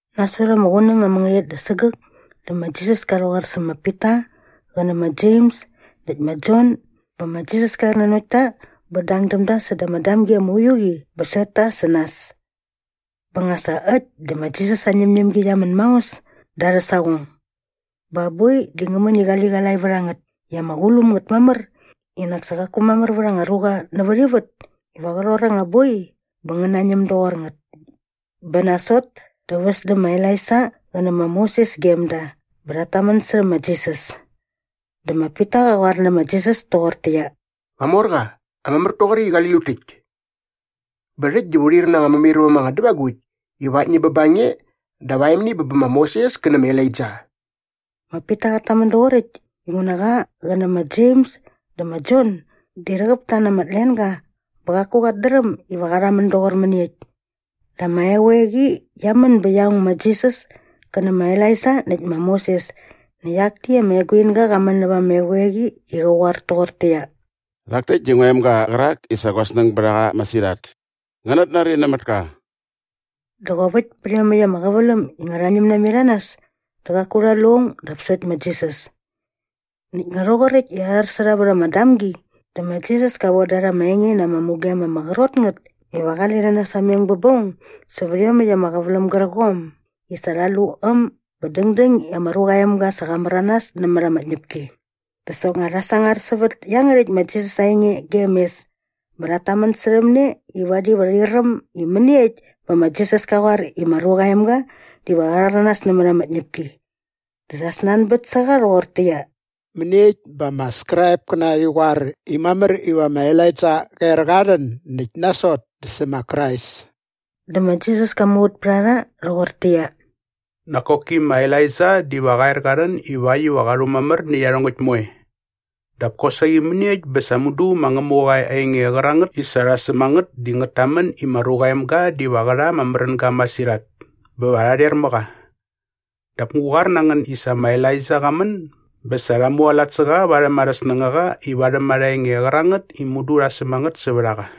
Nasot ama qunäng ama ngärhäqyet da sägäk dä ma Jisas ka rhäqoar sä ma Pita qä nä ma Jems näkt ma Jon bä ma Jisas ka er nanokt ta bä dang däm da säda ama damgi ama uiu qi bä sokt ta sä nas. Bä nga sa äkt dä ma Jisas aa ñämñämgi qia män maos da arhä saqong. Bä aa boi di ngä män i qaliqalae vät a ngät i ama qulum ngät mamär i nak sa qaku mamär vät anga ruqa nävät ivät iva qä rhor anga boi bä ngä nañäm doqor ngät. Bä nasot dä väs dä ma Elaija qä nä ma Moses gem da bä rhat tamän särhä ma Jisas. Dä ma Pita qa qoar nä ma Jisas toqortäqyia, “Qamorqa, ama mär toqoräkt i qali lut täkt. Bä rhäkt diva u rhair na anga mämairväm anga dävagukt iva aktni bä ba nge dap aemni bä ma Moses kä nä ma Elaija.” Ma Pita qat tamän doqoräkt inguna qa qä nä ma Jems dä ma Jon di rhäqäp ta na ama tlenga bä qaku qat dräm iva qa rhamän doqor mäniekt. Dä ama eqoeqi qia män bä qia ong ma Jisas kä nä ma Elaija näkt ma Moses näkt akni ama eguinga qa män näva ama eqoeqi i qä qoar toqortäqyia, “Rhak täkt di ngua emga qärak i sa gua snäng bät a qa masirhat. Ngänät nari nämät ka!” Dä qop äkt pät iomäkt ama qäväläm i nga rha ñäm namet a nas dä qaku rha lu aung dap sokt ma Jisas. Näkt nga rhoqoräkt i arhar sä rha vät ama damgi dä ma Jisas ka von da rha ama enge na ama mugem ama qrot ngät iva qale rhi nasameng bä ba aung sävät iomäkt ama qäväläm gärqom i sa rha lu äm bä dängdäng i ma Ruqa aa Emga sa qa märanas nämät ama tñäpki. Dä soknga rha sangar sävät iangärhäkt ma Jisas aa enge gem mes bä rhat tamän särhäm ne i vadi va rhi räm i mäniekt bä ma Jisas ka qoar i ma Ruqa aa Emga diva qa rhäranas nämät ama tñäpki. Dä rha snanbät sä qa rhoqortäqyia, “Mäniekt bä ama Skraipkäna rhi qoar i mamär iva ma Elaija qa er qa rhän näkt nasot dä sä ma Krais?” Dä ma Jisas ka muvät pät a rha rhoqortäqyia, “Nak koki ma Elaija diva qa er qa rhän ivakt iva qa rhumamär nä iarhongäkt moe. Dap kosaqi mäniekt bä sa mudu ma Ngämuqa aa enge qärangät i sa rha säm a ngät di ngät tamän i ma Ruqa aa Emga diva qä rha ama märänga masirhat bä va rha rher mä qa? Dap ngu qoar na ngän i sa ma Elaija qa män bä sa rha mualat sä qa varhäm arhä snängaqa i varhäm ama enge qärangät i mudu rha säm a ngät sävät a qa.”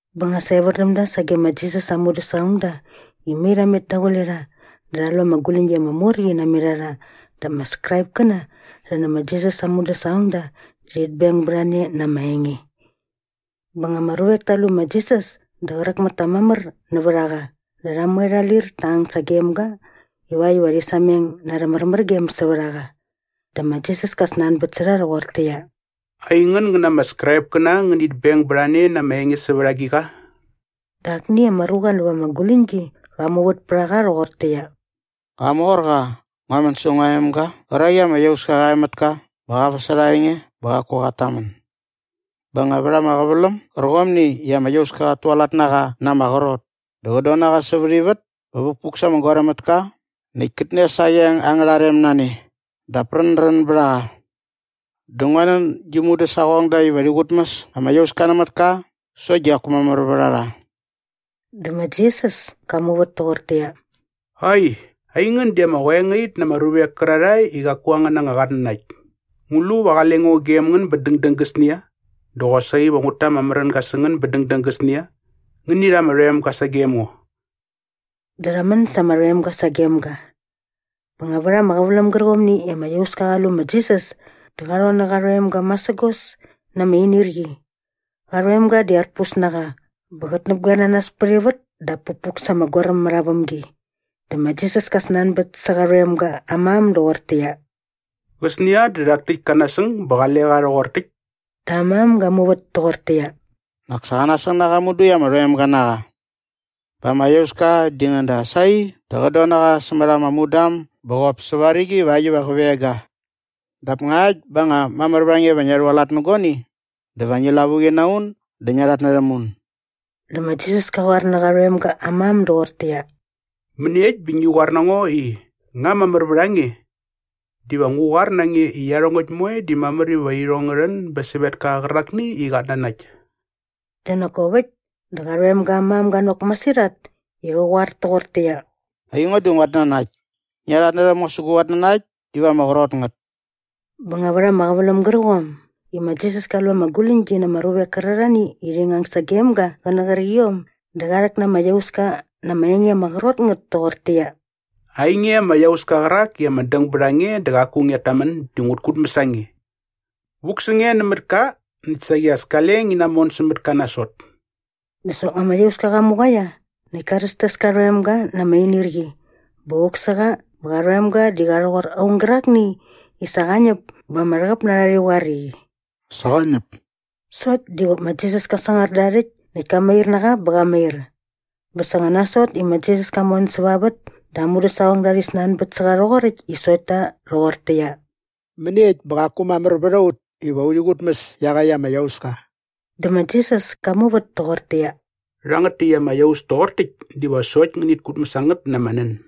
Bä nga sa evär däm da sage ma Jisas aa mudäsaqongda i mai rha met daqule rha dä rha lu ama guläñgi ama mor qi namet a rha dap ama Skraipkäna rhi nä ma Jisas aa mudäsaqongda di rhit beng bät a ne na ama enge. Bä nga ama ruvek ta lu ma Jisas dä qräk mät ta mamär nävät a qa dä rha moe rha lir ta ang sagem ga ivakt iva rhi sameng na arhä märmärgem sävät a qa. Dä ma Jisas ka snanbät sä rha rhoqortäqyia, “Aingän ngän na ama Skraipkäna ngänit beng bät a ne na ama enge sävät agiqa?” Dä akni ama ruqa näva ama guläñgi qa muvät pät a qa rhoqortäqyia, “Qamorqa, ngua män sä ngua emga qärak i ama iauska qa e mät ka bä qa väsärha aa enge bä qaku qat tamän. Bä nga vät ama qäväläm gärqomni i ama iauska qat tualat na qa na ama qrot dä qät don na qa sävät ivät bä vukpuk sa ama goaräm mät ka näkt kät nes aa qeng angärha rem na ne dap rändrän bät a qa. Dä ngua nän gi mudäsaqongda iva rhi qutmäs ama iauska nämät ka sokt di qaku mamär vät a rha.” Dä ma Jisas ka muvät toqortäqyia, “Ai, aingän di ama qoengait na ama ruvek kärarhae i qaku angän anga qatnanakt. Ngu lu va qale ngo gem ngän bä dängdäng gäsnia? Dä qosaqi va ngut ta ama märänga sä ngän bä dängdäng gäsnia? Ngäni rha ama rhoemga sagem ngo.” Dä rha män sa ama rhoemga sagem ga. Bä nga vät ama qäväläm gärqomni i ama iauska qa lu ma Jisas dä qa rhon nä qa rhoemga masägos na ama inirqi. Qa rhoemga di arpus na qa bä qät näpgoer na nas pät ivät dap pukpuk sa ama goaräm mät aa vämgi. Dä ma Jisas ka snanbät sä qa rhoemga aa mam doqortäqyia, “Qäsnia dä rhak täkt ka nasäng bä qale qa rhoqor täkt?” Dä aa mam ga muvät toqortäqyia, “Nak sa qa nasäng mudu i ama rhoemga na qa. Bä ama iauska di ngäda sai dä qät don na qa sämät ama mudam bä qop säva rigi ivakt iva qä veng ga. Dap ngakt bä nga mamär vät a nge iva ngia rhualat nä guani dä va ngi lavuqi na un dä ngia rhatnärhäm un.” Dä ma Jisas kä qoar nä qa rhoemga aa mam doqortäqyia, “Mäniekt bä ngi qoar na ngo i, ‘Nga mamär vät a nge?’ Diva ngu qoar na nge i iarhongäkt moe di mamär iva irhong ngä rhän bä sävetka qärakni i qat nanakt.” Dä nak kop äkt dä qa rhoemga aa mam ga nok masirhat i qä qoar toqortäqyia, “Aingo di nguat nanakt. Ngia rhatnärhäm ngo sä gu qatnanakt iva ama qrot ngät.” Bä nga vät ama qäväläm gärqom i ma Jisas ka lu ama guläñgi na ama ruvek kärarhani i rhi ngang sagem ga qä nä qärqiom dä qa rhäk na ama iauska na ama enge ama qrot ngät toqortäqyia, “Ainge ama iauska qärak i ama däng bät a nge dä qaku ngiat tamän di ngut kutmäs a nge. Vuk sä nge nämät ka näkt saqi as kale ngi namon sämät ka nasot.” Dä soknga ama iauska qa muqaia näkt ka rhästäs ka rhoemga na ama inirqi bä vuk sä qa bä qa rhoemga di qa rhoqor aung gärakni i sa qa ñäp bä ama rhäqäp na rha rhi qoar i, “Sa qa ñäp.” Sokt di qop ma Jisas ka sangar da aa rhäkt näkt ka mair na qa bä qa mair. Bä sa nga nasot i ma Jisas ka mon säva vät dä aa mudäsaqongda rhi snanbät sä qa rhoqoräkt i sokt ta rhoqortäqyia, “Mäniekt bä qaku mamär vät a ut iva urhi qutmäs iaqäkt ama iauska?” Dä ma Jisas ka muvät toqortäqyia, “Rhangät täkt ama iaus toqor täkt diva sokt ngänit kutmäs a ngät na ama nän.”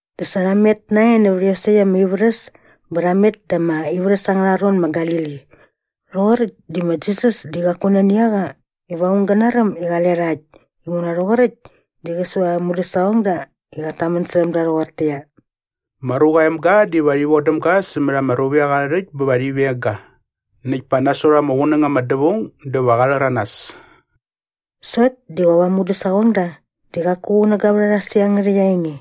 Dä sa rha met nae nävät iosäkt ama ivärhäs bä rha met da ama ivärhäs angärha ron ma Galili. Rhoqoräkt di ma Jisas di qaku nani a qa iva aung gä naräm i qale rha äkt inguna rhoqoräkt di qä su aa mudäsaqongda i qat tamän särhäm da rhoqortäqyia, “Ma Ruqa aa Emga diva rhi vodäm ga sämät ama ruvek arhä rhäkt bä va rhi veng ga. Näkt pa nasot ama qunäng ama dävaung dä va qa rhäranas.” Sokt di qop aa mudäsaqongda di qaku qunäga vät a rha sä iangärhäkt aa enge.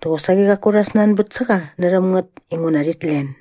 Dä qosaqi qaku rha snanbät sä qa närhäm ngät inguna rhit len.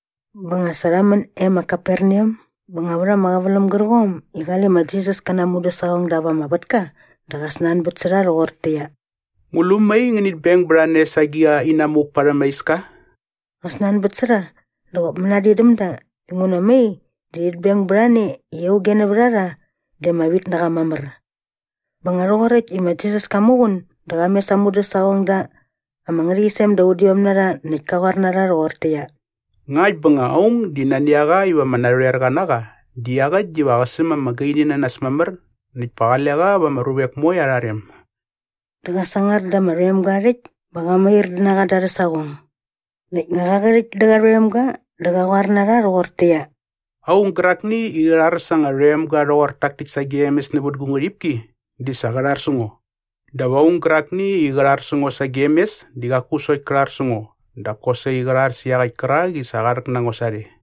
Bä sa nga rha män e ma Kaperneam bä nga vät ama qäväläm gärqom i qale ma Jisas kä na aa mudäsaqongda va ama vätka dä qä snanbät sä rha rhoqortäqyia, “Ngu lu mai ngänit beng bät a ne sa agiqa inamuk parhäm ama iska?” Qa snanbät sä rha dä qop mänadin däm da inguna mai di rhit beng bät a ne i auge nävät a rha di ama vit na qa mamär. Bä nga rhoqoräkt i ma Jisas ka muqun dä qa mes aa mudäsaqongda ama ngärhäqyisem da udiom na rha näkt ka qoar na rha rhoqortäqyia, “Ngakt bä nga aung nani a qa iva ama narhoerqa na qa di iaqäkt diva qä säm ama gaini na nas mamär näkt pa qale qa va ama ruvek moe arha rem.” Dä qa sangar da ama rhoemga aa rhäkt bä qa mair na qa da arhä saqong. Näkt nga qa qärhäkt dä qa rhoemga dä qä qoar na rha rhoqortäqyia, “Aung gärakni i qä rhar sa anga rhoemga rhoqor tak täkt sagem mes nävät gu ngärhipki di sa qä rhar sä ngo. Dap aung gärakni i qä rhar sä ngo sagem mes di qaku sokt kä rhar sä ngo dap kosaqi qä rhar sä iaqäkt kärak i sa qa rhäk na ngo sarhe.”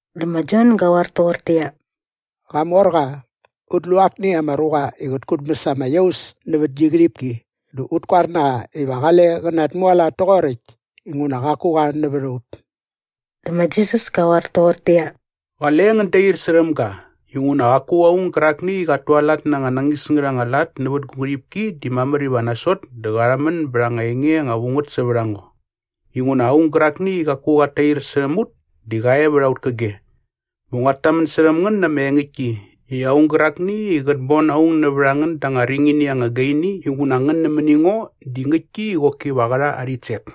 Dä ma Jon gä qoar toqortäqyia, “Qamorqa, ut lu akni ama ruqa i qät kutmäs ama iaus nävät gi ngärhipki dä ut koar na qa iva qale qä natmualat toqoräkt inguna qaku qa nävät a ut.” Dä ma Jisas ka qoar toqortäqyia, “Qale ngän dair särhäm ga inguna qaku aung gärakni i qat tualat na anga nañis ngät anga lat nävät gu ngärhipki di mamär iva nasot dä qa rhamän bät anga enge anga vu ngät sävät a ngo.” Inguna aung gärakni i qaku qat tair särhäm ut di qa e vät aut käge. Bä nguat tamän särhäm ngän na ama engäktki i aung gärakni i qät bon aung nävät a ngän da anga ringini anga gaini inguna ngän nämäni ngo di ngäktki i qoki va qä rha aa rhitsek.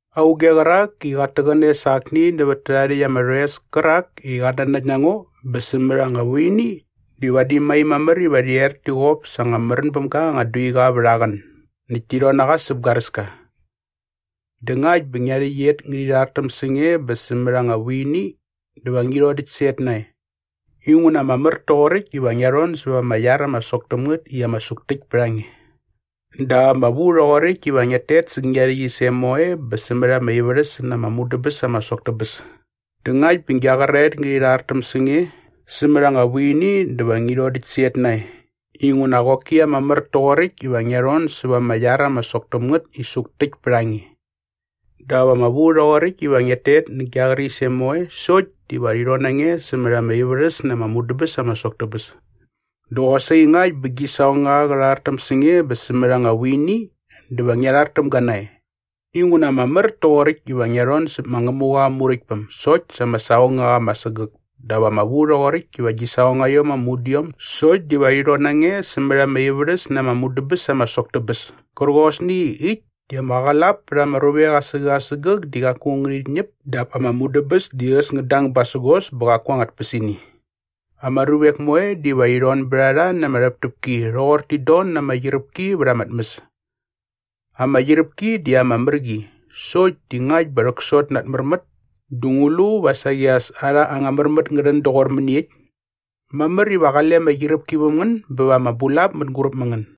“Auge qärak i qat täqäne sa akni nävät tärhae rhäkt ama rhoes kärak i qat nanakt na ngo bä sämät anga vuini di vadi mai mamär iva rhi er ti qop sa anga märän bäm ga anga duiqa vät aa qän näkt ti rhon na qa säp garäska. Dä ngakt bä ngia rhäqyet ngärhi rhartäm sä nge bä sämät anga vuini dä va ngi rhodäkt sä et nae. Inguna ama mär toqoräkt iva ngia rhon säva ama iar ama sok täm ngät i ama suktäkt pät a nge. Dap ama vu rhoqoräkt iva ngiat tet sä gia rhäqyisem moe bä sämät ama ivärhäs na ama mudäbäs ama sok tä bäs. Dä ngakt bä gia qäraet ngärhi rhartäm sä nge sämät anga vuini dä va ngi rhodäkt sä et nae. Inguna qoki ama mär toqoräkt iva ngia rhon säva ama iar ama sok täm ngät i suktäkt pät a nge. Dap ama vu rhoqoräkt iva ngiat tet nä gia qärisem moe sokt diva rhi rhon na nge sämät ama ivärhäs na ama mudäbäs ama sok tä bäs. Dä qosaqi ngakt bä gi saqongaqa qä rhartäm sä nge bä sämät anga vuini dä va ngia rhar täm ga nae. Inguna ama mär toqoräkt iva ngia rhon säp ma Ngämuqa aa Muräktpäm sokt sa ama saqongaqa ama sägäk dap ama vu rhoqoräkt i gi saqongaiom ama udiom sokt diva rhi rhon na nge sämät ama ivärhäs na ama mudäbäs ama sok tä bäs kärqosni i äkt di ‘ama qlap pät ama ruvek asägäk asägäk di qaku ngärhit ñäp dap ama mudäbäs di äs ngät dang basägos bä qaku anga tpäsini.’ “Ama ruvek moe diva rhi rhon bät a rha na ama rhäptäpki rhoqor tit don na ama qyiräpki vät ama tmäs.” “Ama qyiräpki di ama mär qi sokt di ngakt bä rhäksot na at märmät dä ngu lu va saqi as arha anga märmät ngä rhän doqor mäniekt? Mamär iva qale ama qyiräpki väm ngän bä va ama bulap mänguräp mä ngän.”